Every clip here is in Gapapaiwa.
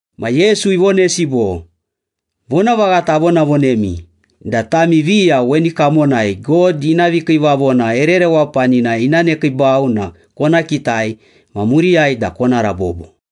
Ma Yesu ivonesi bo, “Vonavaghata avonavonemi da tami viya weni kamonai God ina vikiivavona ere rewapanina ina nekiibau na kona kitai, ma muriyai da kona rabobo.”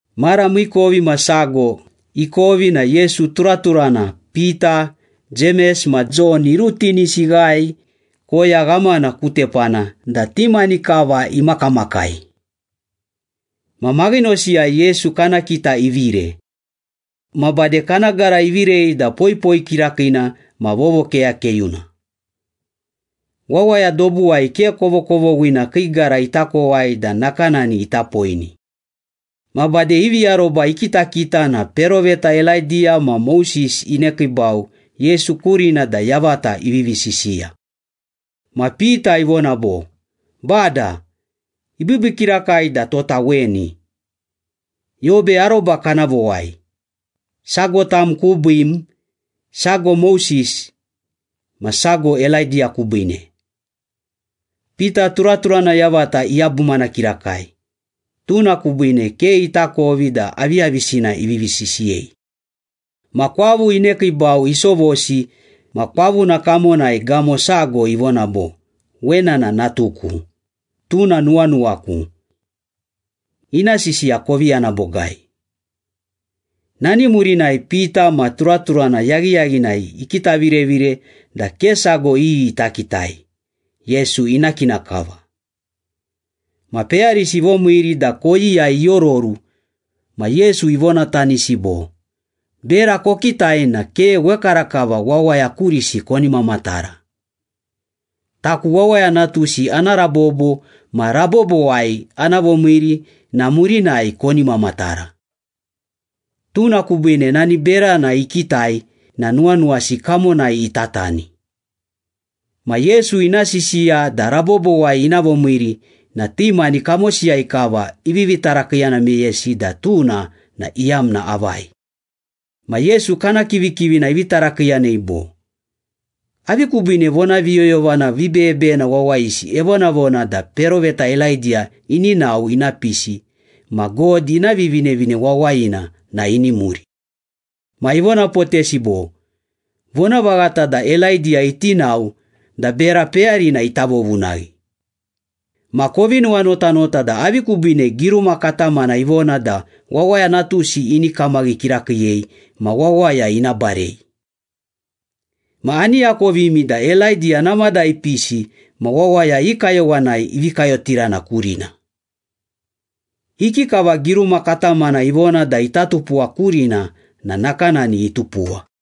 Mara miikovimasago ikovi na Yesu turaturana Pita, Jemes ma Jon irutinisi ighae koya ghamana ku tepana da ti mani kava imakamakai. Ma maghinosiyai Yesu kana kita ivire. Ma bade kana gara ivirei da poipoi kirakiina ma vovokeyakeyuna. Wawaya dobuwai ke kovokovoghina kii gara ita kowai da nakanani ita poini. Ma bade ivi aroba ikitakita na peroveta Elaidiya ma Moses inekiibau Yesu kurina da yavata ivivi sisiya. Ma Pita ivona bo, “Bada, ibiibii kirakai da tota weni. Yobe aroba kana vowai, sago tam kubiim, sago Moses, ma sago Elaidiya kubiine.” Pita turaturana yavata iyabumana kirakai, tuna kubiine ke itakovi da aviyavisina ivivi sisiyei. Ma kwavu inekiibau isovosi ma kwavuna kamonai gamo sago ivona bo, “Wena na natuku, tuna nuwanuwaku. Ina sisiya kovi yana bogai.” Nani murinai, Pita ma turaturana yaghiyaghinai ikitavirevire da ke sago iyi ita kitai, Yesu ina kina kava. Ma peyarisi ivomiiri da koyiyai iororu ma Yesu ivonatanisi bo, “Bera kokitai na ke wekarakava wawaya kurisi koni mamatara. Taku Wawaya Natusi ana rabobo ma rabobowai ana vomiiri na murinai koni mamatara.” Tuna kubiine nani berana ikitai na nuwanuwasi kamonai itatani. Ma Yesu ina sisiya da rabobowai ina vomiiri na ti mani kamosiyai kava ivivi tarakiiyana meyesi da tuna na iyamna avai. Ma Yesu kana kivikivina ivi tarakiiyanei bo, “Avi kubiine vonaviyoyovana vibeyebeyena wawayisi evonavona da peroveta Elaidiya ini nao ina pisi ma God ina Vivinevine Wawayina na ini muri?” Ma ivonapotesi bo, “Vonavaghata da Elaidiya iti nao da bera peyarina ita vovunaghi. Ma kovi nuwanotanota da avi kubiine giruma katamana ivona da Wawaya Natusi ini kamaghi kirakiiyei ma wawaya ina barei. Ma ani akovimi da Elaidiya namada ipisi ma wawaya i kayowanai ivi kayotirana kurina. Ikikava giruma katamana ivona da ita tupuwa kurina na nakanani itupuwa.”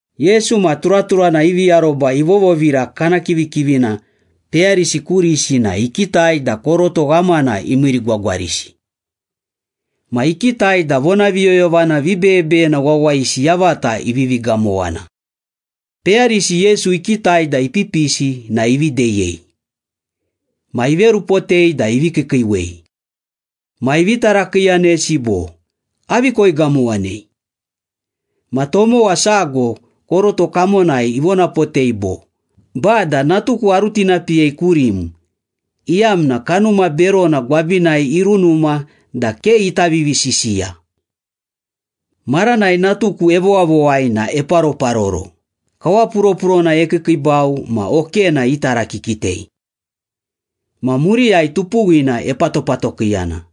Yesu ma turaturana ivi aroba ivovovira kana kivikivina peyarisi kurisi na ikitai da koroto ghamana imiirigwagwarisi. Ma ikitai da vonaviyoyovana vibeyebeyena wawayisi yavata ivivi gamowana. Peyarisi Yesu ikitai da ipipisi na ivi deyei. Ma iverupotei da ivi kiikiiwei. Ma ivi tarakiiyanesi bo, “Avi koigamowanei?” Ma tomowa sago koroto kamonai ivonapotei bo, “Bada, natuku arutinapiyei kurim, iyamna kanuma berona gwabinai irunuma da ke ita vivisisiya. Maranai natuku evowavowai na eparoparoro, kawapuropurona ekiikiibau ma okena itarakikitei. Ma muriyai tupuwina epatopatokiiyana.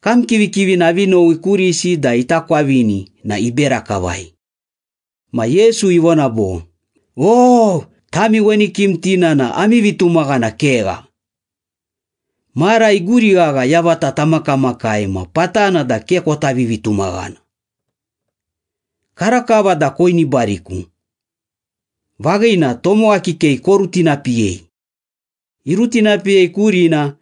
Kam kivikivina avi nowi kurisi da ita kwavini na ibera kavai.” Ma Yesu ivona bo, “O, tami weni kimtina na ami vitumaghana kegha. Mara iguri ghagha yavata tamakamakai ma patana da ke kota vivitumaghana. Karakava da koinibariku. Vaghina, tomowa kikei korutinapiyei.” Irutinapiyei kurina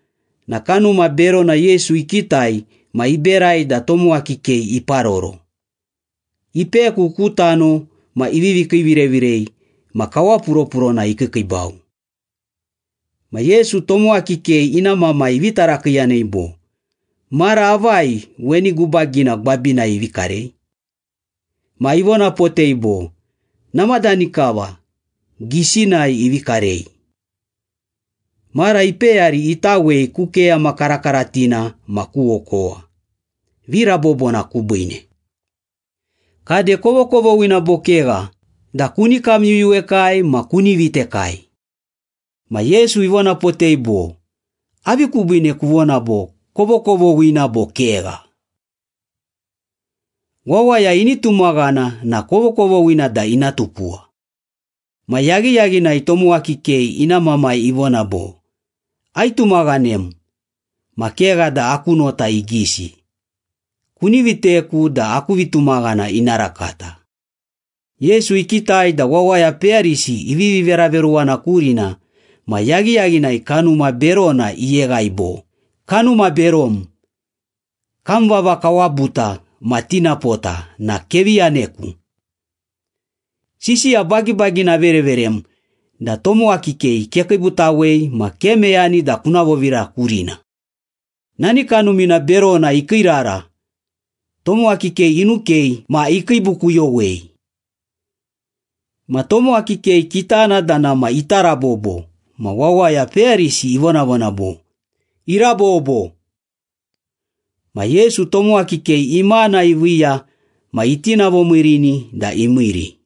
na kanuma berona Yesu ikitai ma iberai da tomowa kikei iparoro, ipeku ku tano ma ivivi kiivirevirei ma kawapuropurona ikiikiibau. Ma Yesu tomowa kikei ina mamai ivi tarakiiyanei bo, “Mara avai weni gubagina gwabinai ivi karei?” Ma ivonapotei bo, “Namadani kava, gisinai ivi karei. Mara ipeyari itawei ku keyama karakaratina ma ku okowa, virabobona kubiine. Kade, kovokovoghina bo kegha da kuni kamyuyuwekai ma kuni vitekai?” Ma Yesu ivonapotei bo, “Avi kubiine kuvona bo, ‘kovokovoghina bo kegha?’ Wawaya ini tumaghana na kovokovoghina da ina tupuwa.” Ma yaghiyaghinai tomowa kikei ina mamai ivona bo, “Aitumaghanem ma kegha da aku nota igisi. Kuni viteku da aku vitumaghana ina rakata.” Yesu ikitai da wawaya peyarisi ivivi veraveruwana kurina ma yaghiyaghinai kanuma berona iyeghai bo, “Kanuma berom, kam vava kawabuta ma tinapota na kevi yaneku. Sisiya bagibagina avereverem da tomowa kikei kekiibutawei ma ke meyani da kuna vovira kurina!” Nani kanumina berona ikiirara, tomowa kikei inukei ma ikiibukuyowei. Ma tomowa kikei kitana da nama ita rabobo ma wawaya peyarisi ivonavona bo, “Irabobo!” Ma Yesu tomowa kikei imana iviiya ma itinavomiirini da imiiri.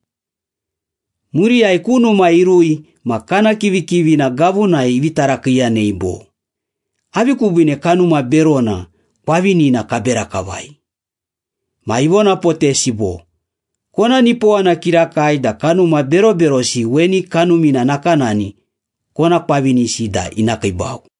Muriyai ku numa irui ma kana kivikivina gavunai ivi tarakiiyanei bo, “Avi kubiine kanuma berona kwavinina kabera kavai?” Ma ivonapotesi bo, “Kona nipowana kirakai da kanuma beroberosi weni kanumina nakanani kona kwavinisi da ina kiibau.”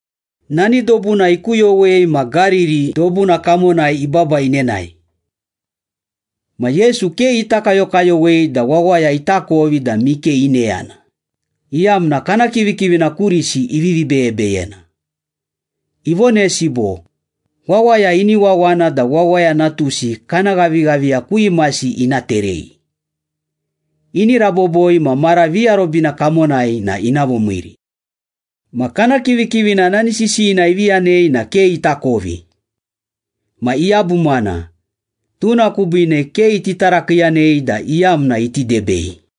Nani dobuna ikuyowei ma Gariri dobuna kamonai ibaba inenae. Ma Yesu ke ita kayokayowei da wawaya itakovi da mike ineyana, iyamna kana kivikivina kurisi ivivi beyebeyena. Ivonesi bo, “Wawaya ini wawana da Wawaya Natusi kana ghavighaviya ku imasi ina terei. Ini raboboi ma mara viarobina kamonai na ina vomiiri.” Ma kana kivikivina nani sisiyina ivi yanei na ke itakovi. Ma iyabumana, tuna kubiine ke iti tarakiiyanei da iyamna iti debei.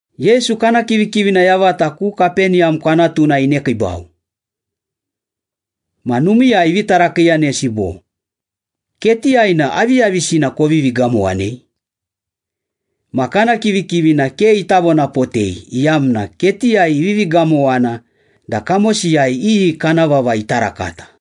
Yesu kana kivikivina yavata ku Kapeniyam kwanatuna inekiibau. Ma numiiyai ivi tarakiiyanesi bo, “Ketiyai na aviyavisina kovivi gamowanei?” Ma kana kivikivina ke ita vonapotei iyamna ketiyai ivivi gamowana da kamosiyai iyi kana vava ita rakata.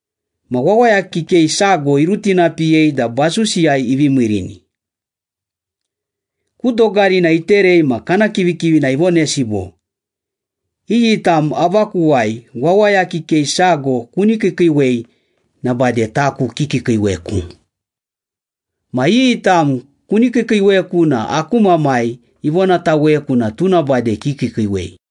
Ma wawaya kikei sago irutinapiyei da basusiyai ivi miirini. Ku dogarina iterei ma kana kivikivina ivonesi bo, “Iyi tam avakuwai wawaya kikei sago kuni kiikiiwei na bade taku kikiikiiweku. Ma iyi tam kuni kiikiiweku na aku Mamai ivonataweku na tuna bade kikiikiiwei.”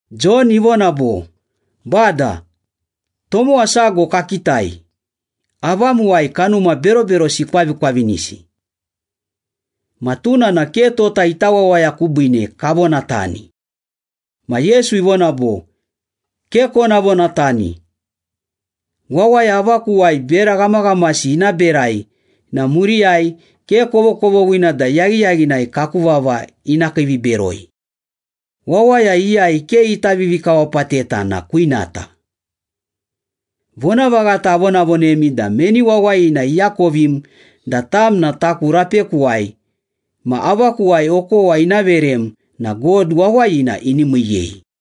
Jon ivona bo, “Bada, tomowa sago kakitai, avamuwai kanuma beroberosi ikwavikwavinisi. Ma tuna na ke tota ita wawaya kubiine kavonatani.” Ma Yesu ivona bo, “Ke kona vonatani. Wawaya avakuwai bera ghamaghamasi ina berai na muriyai ke kovokovoghina da yaghiyaghinai kaku vava ina kiiviberoi. Wawaya iyai ke ita vivikawapateta na kwinata. Vonavaghata avonavonemi da meni wawayina iakovim da tam na taku rapekuwai ma avakuwai okowa ina verem na God wawayina ini miiyei.”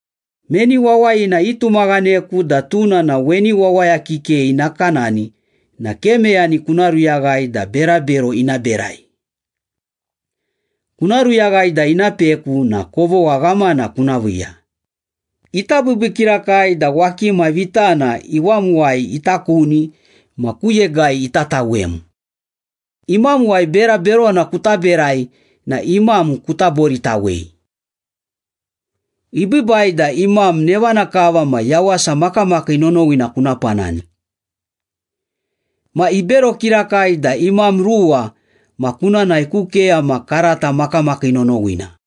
“Meni wawayina itumaghaneku da tuna na weni wawaya kikei nakanani na ke meyani kuna ruyaghai da berabero ina berai. Kuna ruyaghai da ina peku na kovogha ghamana kuna viiya, ita biibii kirakai da wakima vitana iwamuwai ita kuni ma ku yegai ita tawem. Imamuwai bera berona kuta berai na imam kuta boritawei. Ibiibai da imam nevana kava ma yawasa makamakii nonowina kuna panani. Ma ibero kirakai da imam ruwa ma kuna nae ku keyama karata makamakii nonowina.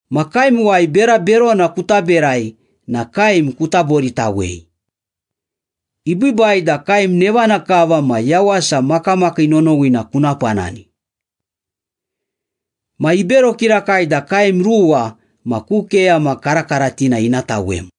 Ma kaemuwai bera berona kuta berai na kaem kuta boritawei. Ibiibai da kaem nevana kava ma yawasa makamakii nonowina kuna panani. Ma ibero kirakai da kaem ruwa ma ku keyama karakaratina ina tawem.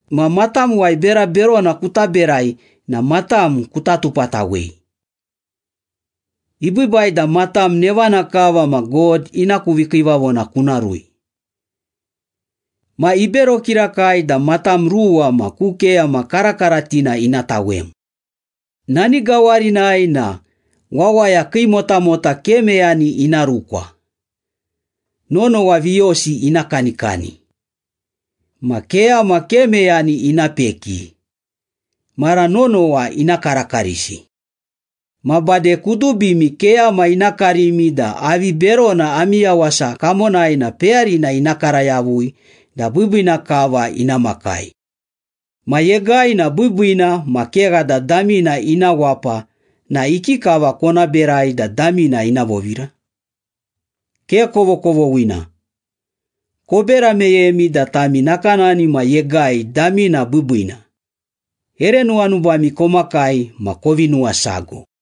Ma matamuwai bera berona kuta berai na matam kuta tupatawei. Ibiibai da matam nevana kava ma God ina ku vikiivavona kuna rui. Ma ibero kirakai da matam ruwa ma ku keyama karakaratina ina tawem. Nani gawarinai na, ‘Wawaya kii motamota ke meyani ina rukwa, nonowa viyosi ina kanikani. Ma keyama ke meyani ina peki, mara nonowa ina karakarisi.’” “Ma bade kudubimi keyama ina karimi da avi berona ami yawasa kamonai na peyarina ina kara yavui da biibiina kava ina makai.” “Ma yegai na biibiina ma kegha da damina ina wapa na ikikava kona berai da damina ina vovira? Ke kovokovoghina. Kobera meyemi da tami nakanani ma yegai damina biibiina, ere nuwanubami komakai ma kovi nuwasago.”